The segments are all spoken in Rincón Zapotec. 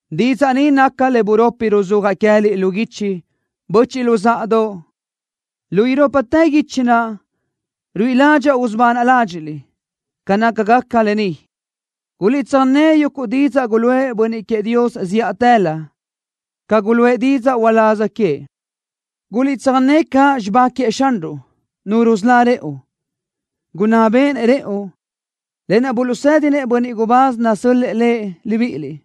Didzaʼ ni naca le buropi ruzúajaʼ queë́liʼ lu guichi, böchiʼ luzáʼadoʼ. Lu irópatë guichi naʼ ruíʼi ládxaʼa usubanaʼ ládxiʼliʼ ca nácagaca lë ni. Guliʼtsöjné yuguʼ didzaʼ guluʼë bönniʼ queëʼ Dios zíʼatëlö, ca guluʼë didzaʼ uláz queëʼ. Guliʼtsöjné caʼ xibá naʼ Xanruʼ, Nu rusölá rëʼu, gunná béʼenëʼ rëʼu, lë naʼ buluʼsédinëʼ bönniʼ gubáz nasö́l-lëʼë Lëʼ libíʼiliʼ.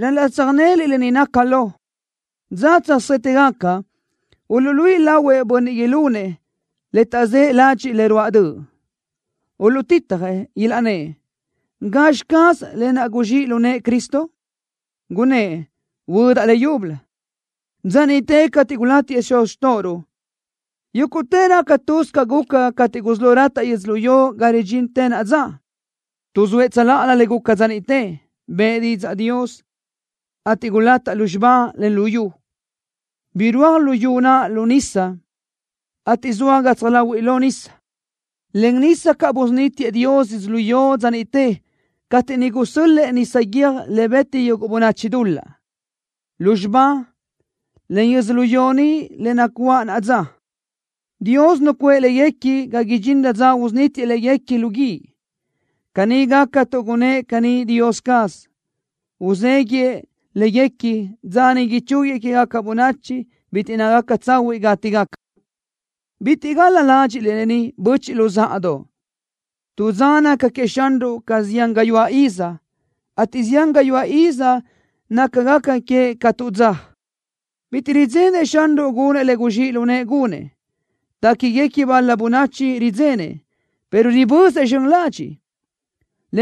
Ral-laʼ tsöjnéliʼ lë ni naca lo. Dza tsöjsétëgaca uluʼluíʼi lahuëʼ bönniʼ ilunëʼ le taʼzë́ ládxëʼë le ruáʼ döʼ. Uluʼtitjëʼ, ilaʼnnë́ʼ: “¿Gazxi caz lë naʼ guzxíʼ lu nëʼë Cristo? Gunnë́ʼ: Huödaʼ leyúbölö. Dza niʼte cateʼ gulátiëʼ xuz xtóʼoruʼ, yúguʼtë raca tuz ca guca cateʼ gusí lo rataʼ yödzölió ga ridxintë naʼa dza.” Tuʼzóëʼ tsöláʼalö le guca dza niʼte. Bëʼë didzaʼ Dios, ateʼ gulataʼ lúzxiba, en luyú. Birúaj luyú naʼ lu nisa ateʼ zoa gatsaj láhuiʼlö nisa. Len nisa caʼ busunítiëʼ Dios yödzölió dza niʼte cateʼ niʼ gusö́l-lëʼë nisa guiö́j le beti yuguʼ bönachi dul-laʼ. Lúzxiba, en yödzölió ni le nacuáʼ naʼa dza, Dios nucuʼë léguequi ga idxinrö dza usunítiëʼ léguequi lu guíʼ. Caní gaca tuʼ gunnë́ʼ caní Dios caz. Uzéguiʼë léguequi dza niʼ ichúguiëʼ quégaca bönachi bitiʼ nácagaca tsahuiʼ gátigaca. Bitiʼ gal-la ládxiʼliʼ lë ni, böchiʼ luzáʼadoʼ. Tu dza naca queëʼ Xanruʼ ca zián gayuáʼ iz, ateʼ zián gayuáʼ iz nácagaca queëʼ ca tu dza. Bitiʼ ridzenëʼ Xanruʼ gunëʼ le guzxíʼ lu nëʼë gunëʼ. Téquiguequi bal-la bönachi ridzenëʼ, pero ribözëʼ zxön ladxiʼ,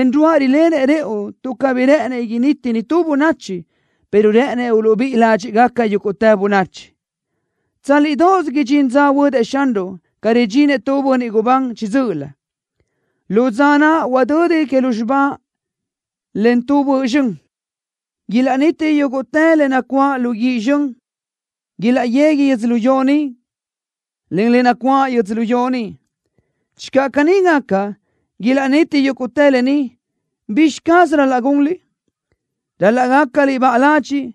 en ruáʼ rilenëʼ rëʼu tuʼ cabí rë́ʼënëʼ initi nitú bönachi, pero rë́ʼënëʼ uluʼbíʼi ládxiʼgaca yúguʼtë bönachi. Tsálidoʼos idxín dza huödëʼ Xanruʼ ca ridxinëʼ tu bönniʼ gubán chiʼi dzö́ʼölö. Lu dza naʼ huadödi que lúzxiba len tu bö zxön. Ilaʼniti yúguʼtë le nacuáʼ lu guíʼ zxön. Ilaʼyegui yödzölió ni, en le nacuáʼ yödzölió ni. Channö caní gaca, ilaʼniti yúguʼtë lë ni, ¿bizxi caz ral-laʼ gunliʼ? Ral-laʼ gácaliʼ baʼa ladxiʼ,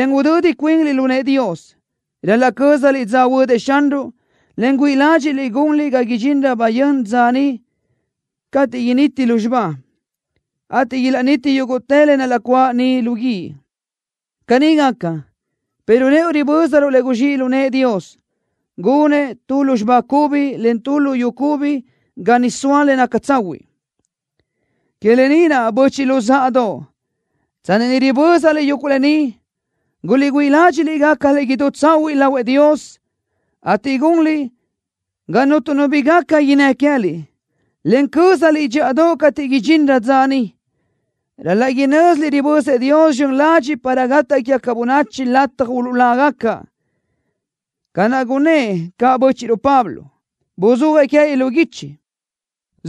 en udödi cuinliʼ lu nëʼë Dios. Ral-laʼ cö́zaliʼ dza huödëʼ Xanruʼ, en güíʼi ládxiʼliʼ gunliʼ ga idxinrö bayö́n dza niʼ cateʼ initi lúzxiba, ateʼ ilaʼniti yúguʼtë le nacuáʼ ni lu guíʼ. Caní gaca, pero rëʼu ribö́zaruʼ le guzxíʼ lu nëʼë Dios. Gunëʼ tu lúzxiba cubi, en tu luyú cubi ga niʼ soa le naca tsahuiʼ. Que lë ni naʼ, böchiʼ luzáʼadoʼ, tsanni ni ribö́zaliʼ yuguʼ lë ni, guliʼgüíʼ ládxiʼliʼ gácaliʼ idú tsahuiʼ lahuëʼ Dios, ateʼ gunliʼ ga cuntu nu bi gaca innë́ queë́liʼ, en cö́zaliʼ dxíʼadoʼ cateʼ idxinrö dza niʼ. Ral-laʼ inö́ziliʼ ribözëʼ Dios zxön ladxiʼ para gataʼ quégaca bönachi lataj uluʼlágaca, ca naʼ gunnë́ʼ caʼ bö́chiʼruʼ Pablo. Buzúajëʼ queë́liʼ lu guichi,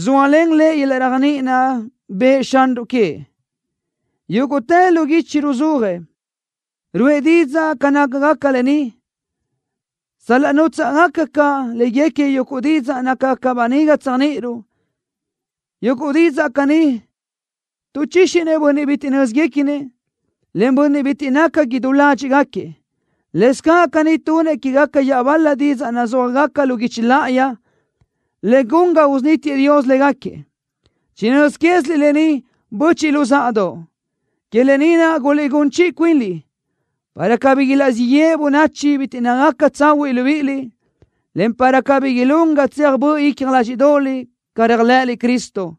zóalen lëʼ yöl-laʼ réajniʼi naʼ bëʼë Xanruʼ queëʼ. Yúguʼtë lu guichi ruzúajëʼ, ruʼë didzaʼ ca nácagaca lë ni, sal-laʼ nútsaʼgaca caʼ léguequi yuguʼ didzaʼ nácagaca böniga tséajniʼiruʼ. Yuguʼ didzaʼ caní tuʼchíxinëʼ bönniʼ bitiʼ nö́zguequinëʼ, en bönniʼ bitiʼ naca idú ládxiʼgaquiëʼ. Lëscaʼ caní tunëʼ quégaca iaʼbal-la didzaʼ nazúajgaca lu guichi láʼayi, le gun ga usunítiëʼ Dios légaquiëʼ. Chinö́z quéziliʼ lë ni, böchiʼ luzáʼadoʼ. Que lë ni naʼ guliʼgún chiʼi cuinliʼ, para cabí ilaʼzíʼ yeʼe bönachi bitiʼ nácagaca tsahuiʼ libíʼiliʼ, en para cabí ilún ga tseaj böʼ icja ládxiʼdoʼoliʼ ca réajlëʼëliʼ Cristo.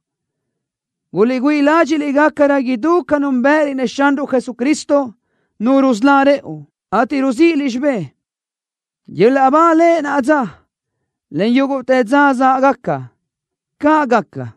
Guliʼgüíʼ ládxiʼliʼ gácarö idú ca núnbëʼëliʼ-nëʼ Xanruʼ Jesucristo, Nu rusölá rëʼu, ateʼ ruzíʼiliʼ xibë́ʼ. ¡Yöl-laʼ ba Lëʼ naʼa dza, en yúguʼtë dza záʼgaca! ¡Caʼ gaca!